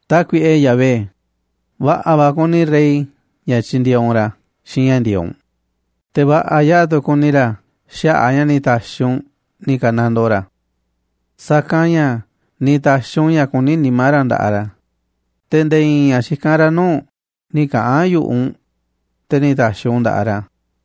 Tákuiꞌe Yahvé, va̱ꞌa̱ va̱ kuni rey ña̱ tyindieeꞌ u̱nꞌ ra̱ xiinꞌ ña̱ ndi̱e̱eꞌ u̱nꞌ, te̱ va̱ꞌa̱ yaꞌa̱ tu̱ kuni ra̱ xaꞌa̱ꞌ a̱ ña̱ ni̱ ta̱xi̱ u̱nꞌ ni̱ ka̱nandoo ra̱. Sa̱kanꞌ ña̱ ni̱ ta̱xi̱ u̱nꞌ ña̱ kuní nimá ra̱ nda̱ꞌaꞌ ra̱, te̱ nde̱e̱ i̱i̱n ña̱ xikán ra̱ nuu̱ꞌ u̱nꞌ nï̱ kaꞌa̱n yu̱ꞌuꞌ u̱nꞌ, te̱ ni̱ ta̱xi̱ u̱nꞌ u̱n nda̱ꞌaꞌ ra̱.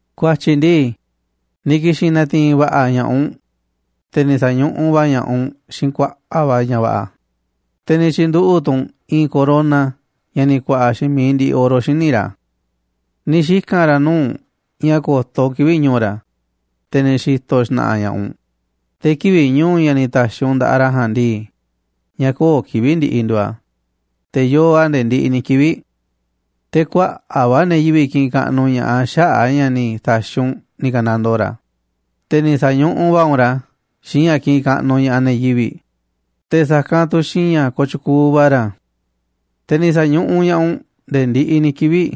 Ku̱a̱tyi̱ ndii, ni̱ ki̱xi̱n na̱ti̱i̱n va̱ꞌa̱ ña̱ꞌaꞌ u̱nꞌ, te̱ ni̱ sa̱ñuꞌuꞌ va̱ ña̱ꞌaꞌ u̱nꞌ xiinꞌ kuaꞌa̱ꞌ va̱ ña̱ va̱ꞌa̱, te̱ ni̱ tyi̱nduꞌu̱ꞌ tu̱ u̱nꞌ i̱i̱n corona ña̱ ni̱ ku̱a̱ꞌa̱ xiinꞌ mi̱iꞌ ndiꞌiꞌ oro xíniꞌ ra̱. Ni̱ xika̱n ra̱ nuu̱ꞌ u̱nꞌ ña̱ ko̱to̱ u̱nꞌ kivi̱ꞌ ñu̱u̱ ra̱, te̱ ni̱ xi̱to̱ xna̱ꞌa̱ ña̱ꞌaꞌ u̱nꞌ, te̱ kivi̱ꞌ ñu̱u̱, ña̱ ni̱ ta̱xi̱ u̱nꞌ nda̱ꞌaꞌ ra̱ ja̱a̱nꞌ ndii, ña̱ köo̱ꞌ kivi̱ꞌ ndiꞌiꞌ nduuꞌ a̱, te̱ yoo a̱ nde̱e̱ ndiꞌiꞌ ni̱ kivi̱ꞌ. Te̱ kuaꞌa̱ꞌ va̱ ne̱ yivi̱ꞌ kiꞌinꞌ kaꞌnuꞌ ña̱ꞌaꞌ xaꞌa̱ꞌ a̱ ña̱ ni̱ ta̱xi̱ u̱nꞌ ni̱ ka̱nandoo ra̱, te̱ ni̱ sa̱ñuꞌuꞌ va̱ u̱nꞌ ra̱ xiinꞌ ña̱ kiꞌinꞌ kaꞌnuꞌ ña̱ꞌaꞌ ne̱ yivi̱ꞌ, te̱ sa̱kanꞌ tu̱ xiinꞌ ña̱ kooꞌ tyukuuꞌ va̱ ra̱. Te̱ ni̱ sa̱ñuꞌuꞌ ña̱ꞌaꞌ u̱nꞌ nde̱e̱ ndiꞌiꞌ ni̱ kivi̱ꞌ,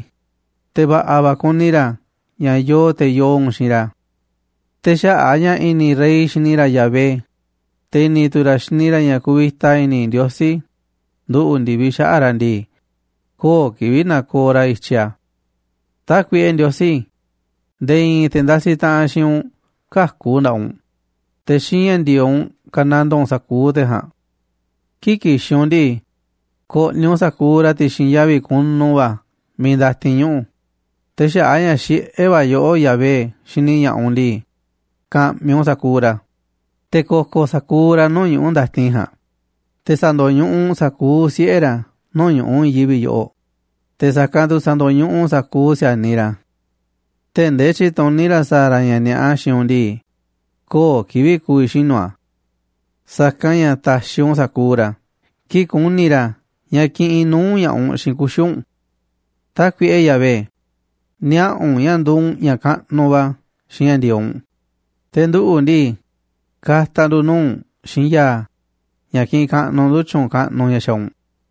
te̱ va̱ꞌa̱ va̱ kuni ra̱ ña̱ yoo te̱ yoo u̱nꞌ xiinꞌ ra̱. Te̱ xaꞌa̱ꞌ a̱ ña̱ i̱ni̱ rey xini ra̱ Yahvé, te̱ i̱ni̱ tu̱ ra̱ xini ra̱ ña̱ kuvita i̱ni̱ Ndiosí nduꞌu̱ꞌ ndi̱viꞌ xaꞌa̱ꞌ ra̱ ndii, köo̱ꞌ kivi̱ꞌ na̱ko̱o̱ ra̱ i̱tyiꞌ a̱. Tákuiꞌe Ndiosí, nde̱e̱ i̱i̱n te̱ ndasiꞌ taꞌanꞌ xiinꞌ u̱nꞌ käku̱ nda̱ꞌaꞌ u̱nꞌ, te̱ xiinꞌ ña̱ ndi̱e̱eꞌ u̱nꞌ ka̱nandoo u̱nꞌ sa̱kuuꞌ te̱ ja̱a̱nꞌ. Kii̱ꞌ ki̱xi̱n u̱nꞌ ndii, ko̱ꞌni̱ u̱nꞌ sa̱kuuꞌ ra̱ ti̱xi̱n yavi̱ kunu va̱ miiꞌ ndatin ñuꞌu̱, te̱ xaꞌa̱ꞌ a̱ ña̱ xiꞌé va̱ yoꞌó, Yahvé, xini ña̱ꞌaꞌ u̱nꞌ ndii, ka̱ꞌmi̱ u̱nꞌ sa̱kuuꞌ ra̱, te̱ ko̱ko̱ sa̱kuuꞌ ra̱ nuu̱ꞌ ñuꞌu̱ ndatin ja̱a̱nꞌ. Te̱ sa̱ndo̱ñuꞌuꞌ u̱nꞌ sa̱kuuꞌ siꞌe̱ ra̱ nuu̱ꞌ ñu̱ꞌuꞌ i̱i̱n yivi̱ꞌ yoꞌoꞌ, te̱ sa̱kanꞌ tu̱ sa̱ndo̱ñuꞌuꞌ u̱nꞌ sa̱kuuꞌ si̱a̱niꞌ ra̱. Tee̱ꞌ ndee tyi̱tuní ra̱ sa̱a̱ ra̱ ña̱ ni̱a̱ꞌa xiinꞌ u̱nꞌ ndii, köo̱ꞌ kivi̱ꞌ ku̱vi̱ xinu̱ a̱. Sa̱kanꞌ ña̱ ta̱xiꞌ u̱nꞌ sa̱kuuꞌ ra̱ kii̱ꞌ ku̱ni̱ ra̱ ña̱ kiꞌinꞌ nuu̱ꞌ ña̱ꞌaꞌ u̱nꞌ xiinꞌ kuxi̱ u̱nꞌ. Tákuiꞌe Yahvé, niaꞌa̱ u̱nꞌ ña̱ nduuꞌ u̱nꞌ ña̱ kaꞌnuꞌ va̱ xiinꞌ ña̱ ndi̱e̱eꞌ u̱nꞌ, te̱ nduꞌu̱ ndii, ka̱ta̱ ndu̱ nuu̱ꞌ u̱nꞌ xiinꞌ ya̱a̱ ña̱ kiꞌinꞌ kaꞌnuꞌ ndu̱ tyu̱u̱n kaꞌnuꞌ ña̱ xaaꞌ u̱nꞌ.